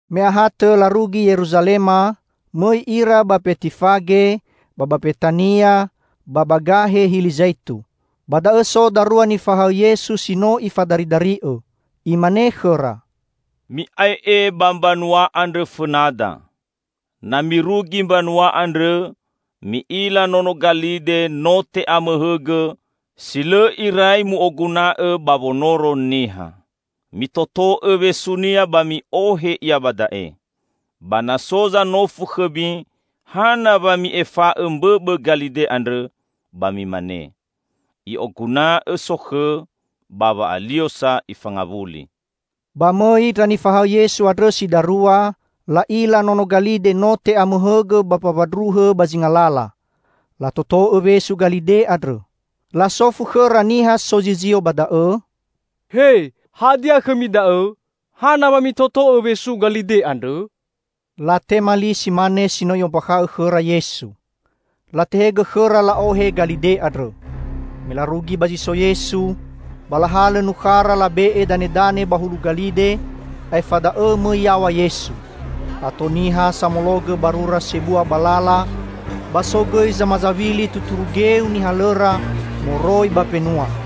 Me ahatõ larugi Yeruzalema, mõi ira ba Mbetifage, ba ba Mbetania, ba gahe Hili Zaitu. Ba da'õ so darua nifahaõ Yesu si no Ifadaridari'õ. Imane khõra, "Mi'ae'e ba mbanua andrõ fõnada. Na mirugi mbanua andrõ, mi'ila nono galide no te'amõhõgõ, si lõ irai mu'oguna'õ ba wonoro niha. Mitoto'õ wesunia ba mi'ohe ia ba da'e. Ba na so zanofu khõmi hana wa mi'efa'õ mbõbõ galide andrõ, ba mimane, 'I'oguna'õ sokhõ, ba wa'ali'o sa Ifangawuli.'" Ba mõi ndra nifahaõ Yesu andrõ si darua, la'ila nono galide no te'amõhõgõ ba mbawandruhõ ba zinga lala. Latoto'õ wesu galide andrõ. Lasofu khõra niha sozizio ba da'õ, "He, hadia khõmi da'õ? Hana wamitoto'õ wesu galide andrõ?" Latema li si mane si no I'ombakha'õ khõra Yesu. Latehegõ khõra la'ohe galide andrõ. Me larugi ba zi so Yesu, ba lahalõ nukhara labe'e danedane ba hulu galide, aefa da'õ mõi yaw̃a Yesu. Ato niha samologõ barura sebua ba lala, ba so gõi zamazawili tuturu geu nihalõra moroi ba mbenua.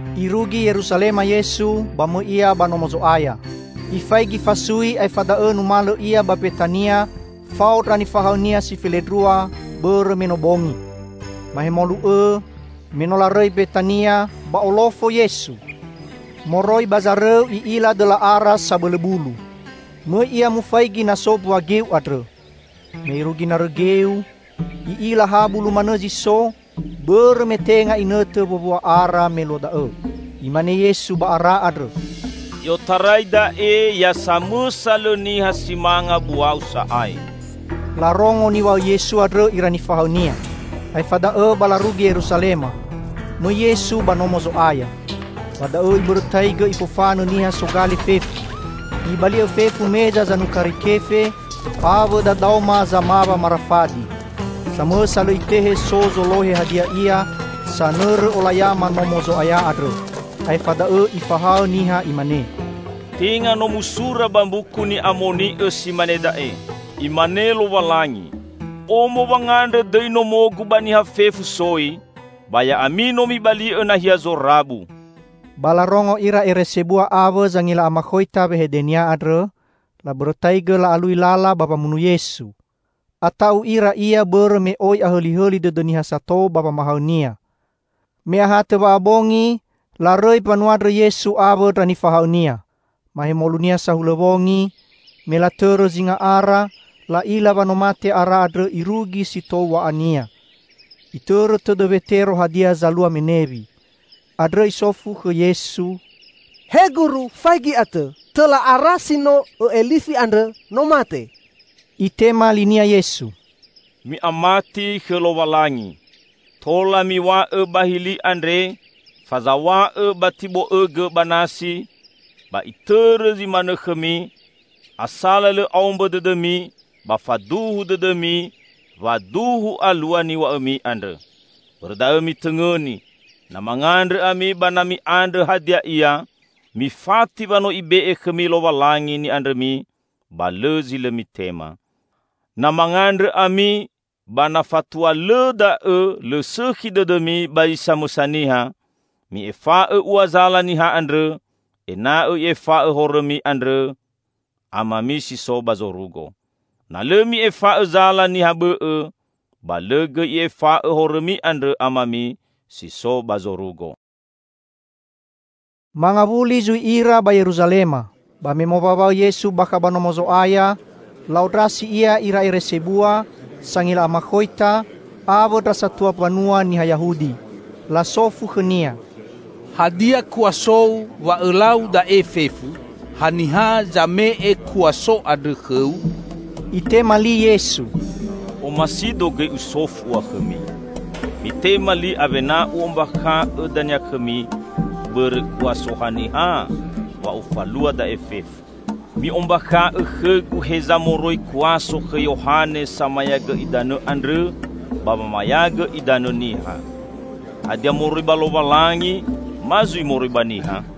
Irugi Yeruzalema Yesu, ba mõi Ia ba Nomo Zo'aya. Ifaigi fasui, aefa da'õ numalõ Ia ba Mbetania fao ndra nifahaõ-Nia si felendrua, bõrõ me no bongi. Mahemolu õ, me no larõi Mbetania, ba olofo Yesu. Moroi ba zarõu I'ila dõla ara sabõlõ bulu. Mõi Ia mufaigi na so mbua geu andrõ. Me Irugi narõ geu, I'ila ha bulu manõ zi so, bõrõ me tenga inõtõ wowua ara me luo da'õ. Imane Yesu ba ara andrõ, "I'otarai da'e ya samõsa lõ niha si manga buau sa'ae!" Larongo niw̃a'õ Yesu andrõ ira nifahaõ-Nia. Aefa da'õ ba larugi Yeruzalema. Mõi Yesu ba Nomo Zo'aya. Ba da'õ Ibõrõtaigõ Ifofanõ niha sogale fefu. Ibali'õ fefu meza zanukari kefe, awõ dadaoma zamawa marafadi. Samõsa lõ Itehe so zolohe hadia ia sanõrõ olayama Nomo Zo'aya andrõ. Aefa da'õ Ifahaõ niha, Imane, "Tenga no musura ba Mbuku Ni'amoni'õ si mane da'e: Imane Lowalangi, 'Omo wangandrõ dõi nomo-Gu ba niha fefu soi!' Ba ya'ami no mibali'õ nahia zorabu!" Ba larongo ira ere sebua awõ zangila amakhoita wehede-Nia andrõ. Labõrõtaigõ la'alui lala ba wamunu Yesu. Ata'u ira Ia, bõrõ me oi ahõlihõli dõdõ niha sato ba wamahaõ-Nia. Me ahatõ wa'abongi, larõi mbanua andrõ Yesu awõ ndra nifahaõ-Nia. Mahemolunia sahulõ wongi, me latõrõ zinga ara, la'ila wa no mate ara andrõ irugi si tou w̃a'ania. Itõrõ tõdõ Wetero hadia zalua menewi. Andrõ isofu Fetero khõ Yesu, "He Guru, faigi atõ! Tõla ara si no Õ'elifi andrõ no mate!" Itema linia Yesu, "Mi'amati khõ Lowalangi, Tola miw̃a'õ ba hili andre, 'Fazaw̃a'õ ba tibo'õgõ ba nasi!' ba itõrõ zi manõ khõmi; asala lõ aombõ dõdõmi, ba faduhu dõdõmi wa duhu alua niw̃a'õmi andrõ. Bõrõ da'õ mitõngõni: Na mangandrõ ami ba na mi'andrõ hadia ia, mifati wa no Ibe'e khõmi Lowalangi ni'andrõmi, ba lõ zi lõ mitema. Na mangandrõ ami, ba na fatua lõ da'õ lõ sõkhi dõdõmi ba zi samõsa niha, mi'efa'õ ua zala niha andrõ, ena'õ I'efa'õ horõmi andrõ Amami si so ba zorugo. [Na lõ mi'efa'õ zala niha bõ'õ, ba lõ gõi I'efa'õ horõmi andrõ Amami si so ba zorugo.]" Mangawuli zui ira ba Yeruzalema. Ba me mowaõwaõ Yesu ba kha ba Nomo Zo'aya, la'ondrasi Ia ira ere sebua, sangila amakhoita awõ ndra satua mbanua niha Yahudi. Lasofu khõ-Nia, "Hadia kuaso-U wa Õlau da'e fefu? Haniha zame'e kuaso andrõ khõ-U?" Itema li Yesu, "Omasi-Do gõi Usofu ua khõmi. Mitema li awena U'ombakha'õ dania khõmi bõrõ kuaso haniha wa Ufalua da'e fefu. Mi'ombakha'õ khõ-Gu heza moroi kuaso khõ Yohane Samayagõ Idanõ andrõ ba wamayagõ idanõ niha; hadia moroi ba Lowalangi ma zui moroi ba niha?"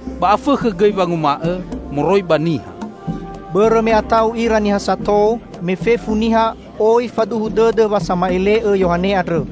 Ba afõkhõ gõi wanguma'õ, 'Moroi ba niha.'" Bõrõ me ata'u ira niha sato, me fefu niha oi faduhu dõdõ wa sama'ele'õ Yohane andrõ.